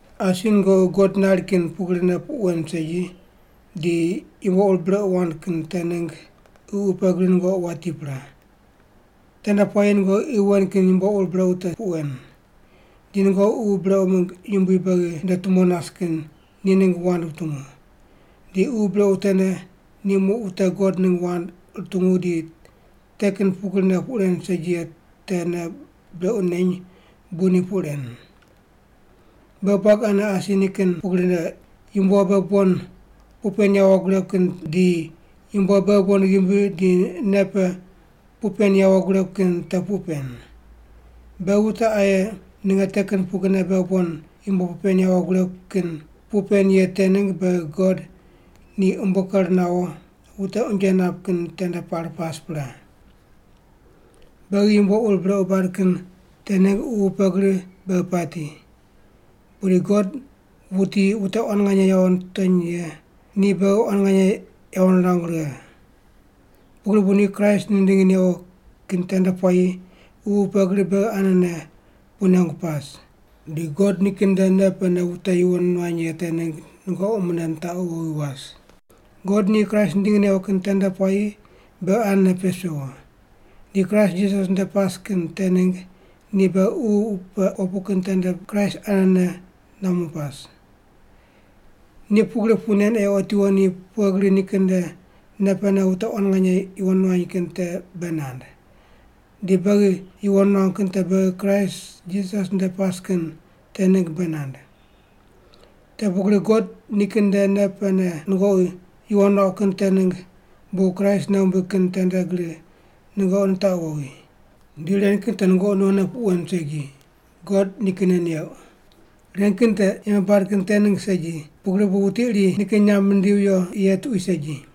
Asi nungoqi God nari kin pugrine puq wen segi di yumbo ur brequ wand kin te ningg ququ pe gri nungoqi wati pre. Tende puayi nungoqi qi wen kin yumbo ur brequ te puq wen. Di nungoqi ququ brequ mingg yumbui beghi nde tumone nas kin ni ningg wand wutungu. Di ququ brequ tene ni muq wute God ningg wand rutungu di te kin pugrine puq ren segi ye te nei brequ neny bu ni puq ren. Beghi buagi ane asi nikin pugrine, yumbo beghi bon puq pen yawo guregu kin di yumbo beghi bon ghimbi di nei pe puq pen yawo guregu kin te puq pen. Beghi wute aye ninge te kin pugrine beghi bon yumbo puq pen yawo guregu kin puq pen ye te ningg beghi God ni umbo ker nawo wute unje nap kin tende par pas pre. Beghi yumbo ur brequ bad kin te ningg ququ pe gri beghi pati. Pudi God, wuti wute quan nganye yawo nitony ye, ni beghi quan nganye yawo nirangu righe. Pugri bu ni Kraist nindingi newo kin tende puayi ququ pe gri beghi anene puq nengu pas. Di God nikin nde nei pene wute yuwon nuany ye te ningg nungoqi mune nitaqu wowi was. God ni Kraist nindingi newo kin tende puayi beghi anene pes pewo, di Kraist Jisas nde pas kin te ningg ni beghi ququ pe opu kin tende Kraist anene nuamu pas. Ni pugri puq nen ei otiwo ni pughe gri nikin nde nei pene wute quan nganye yuwon nuany kin te bei nand. Di beghi yuwon nuangu kin te beghi Kraist Jisas nde pas kin te ningg bei nand. Te pugri God nikin nde nei pene nungoqi yuwon nuauq kin te ningg bu Kraist nei wumbig kin tende gri nungoqi nitaqu wowi. Di ren kin te nungoqi nonne puq wen segi, God nikinne neuq. Ren kin te yembe bad kin te ningg segi, pugri bu wuti iri nikin nyamb nindivi viyo ye tuqui segi.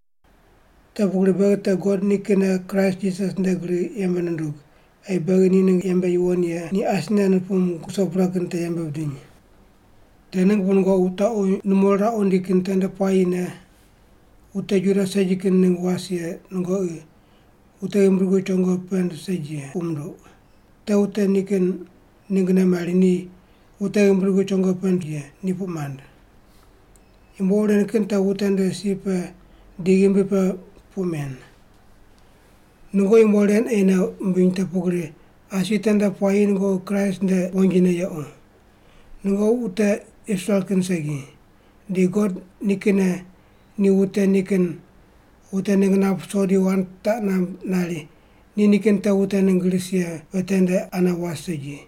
Te pugri beghi te God nikinne Kraist Jisas nde gri yembe nundug ei beghi ni ningg yembe yuwon ye ni asine nupung ruso pre kin te yembe bidiny. Te ningg bu nungoqi wutaqu numo riraqu rindi kin tende puayine wute Juda segi kin ningg was ye nungoqi “wute ghimbi dugu chongo pend segi ye” puq munduq. Te wute nikin ninggne mari ni “wute ghimbi dugu chongo pend ye” ni puq mand. (Yumbo ur ren kin te wute nde si pe di nikin ghimbi pe puq men.) Nungoqi yumbo ren ei nei wumbiny te pugri asi tende puayi nungoqi Kraist nde wonjine yequ. Nungoqi wute Israel kin segi, di God nikinne ni wute nikin wute ningg nap ruso di wand taq namb nari ni nikin te wute ningg ris ye pe tende ane was segi,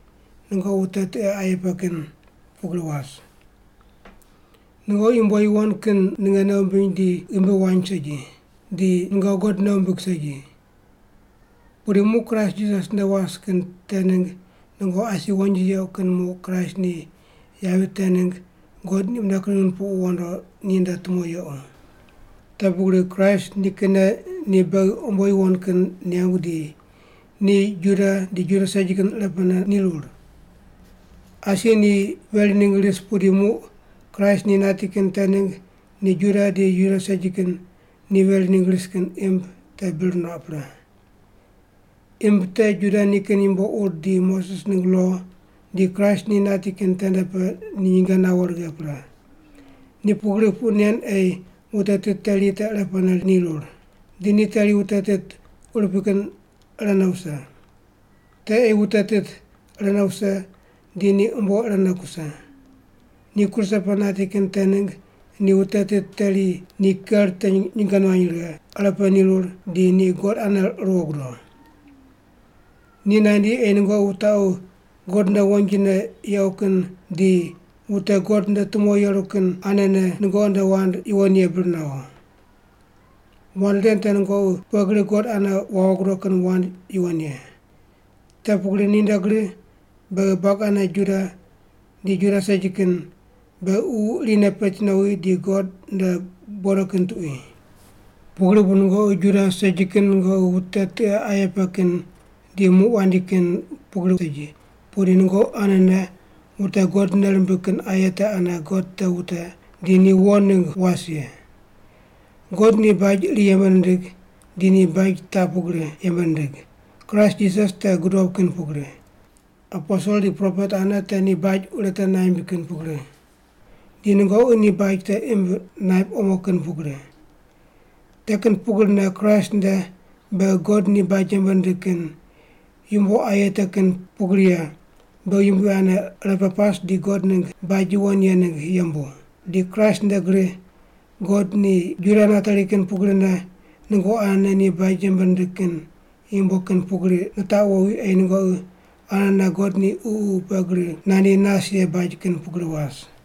nungoqi wute tiqe aye pe kin pugri was. Nungoqi yumbo yuwon kin ninge nei wumbiny di ghimbi wany segi, di nungoqi God nei wumbig segi. Pudi muq Kraist Jisas nde was kin te ningg nungoqi asi wonji yequ kin muq Kraist ni yavi te ningg God ni mune kring nupuqu wondo ninde tumo yequ. Te pugri Kraist nikinne ni beghi umbo yuwon kin nengu di ni Juda di Juda segi kin irepene nirur. Asi ni veri ningg ris pudi muq Kraist ni nati kin te ningg ni Juda di Juda segi kin ni veri ningg ris kin imb te bir nuaq pre. Imb te Juda nikin yumbo ur di Moses ningg lo, di Kraist ni nati kin tende pe ni nyinge nawo righe pre. Ni pugri puq nen ei wute tit teri te irepene nirur. Di ni teri wute tit urupui kin irene wuse. Te ei wute tit irene wuse di ni umbo irene kuse. Ni kruse pe nati kin te ningg ni wute tit teri ni ker te nyinge nuany righe, irepe nirur di ni God ane ruwo gudo. Ni nandi ei nungoqi wutaqu God nde wonjine yequ kin di wute God nde tumo yeru kin anene nungoqi nde wand yuwon ye bir nawo. Wand ren te nungoqi pughe gri God ane wawo gudo kin wand yuwon ye. Te pugri ninde gri beghi buagi ane Juda di Juda segi kin beghi Ququ irine peti nowi di God nde bodo kin tuqui. Pugri bu nungoqi Juda segi kin nungoqi wute tiqe aye pe kin di muq wandi kin pugri segi, pudi nungoqi anene wute God nei rimbig kin aye te ane God te wute di ni wo ningg was ye. God ni baj iri yembe nindig di ni baj taq pugri yembe nindig: Kraist Jisas te gudob kin pugri. Aposel di propet ane te ni baj urete naimb kin pugri. Di nungoqi ni baj te imb naip omo kin pugri. Te kin pugrine Kraist nde beghi God ni baj yembe nindig kin yumbo aye te kin pugri ye beghi Yumbui ane irepe pas di God ningg baj yuwon ye ningg yembu. Di Kraist nde gri God ni Juda nateri kin pugrine nungoqi anene ni baj yembe nindig kin yumbo kin pugri nitaqu wowi ei nungoqi anene God ni Ququ pe gri nandi nas ye baj kin pugri was.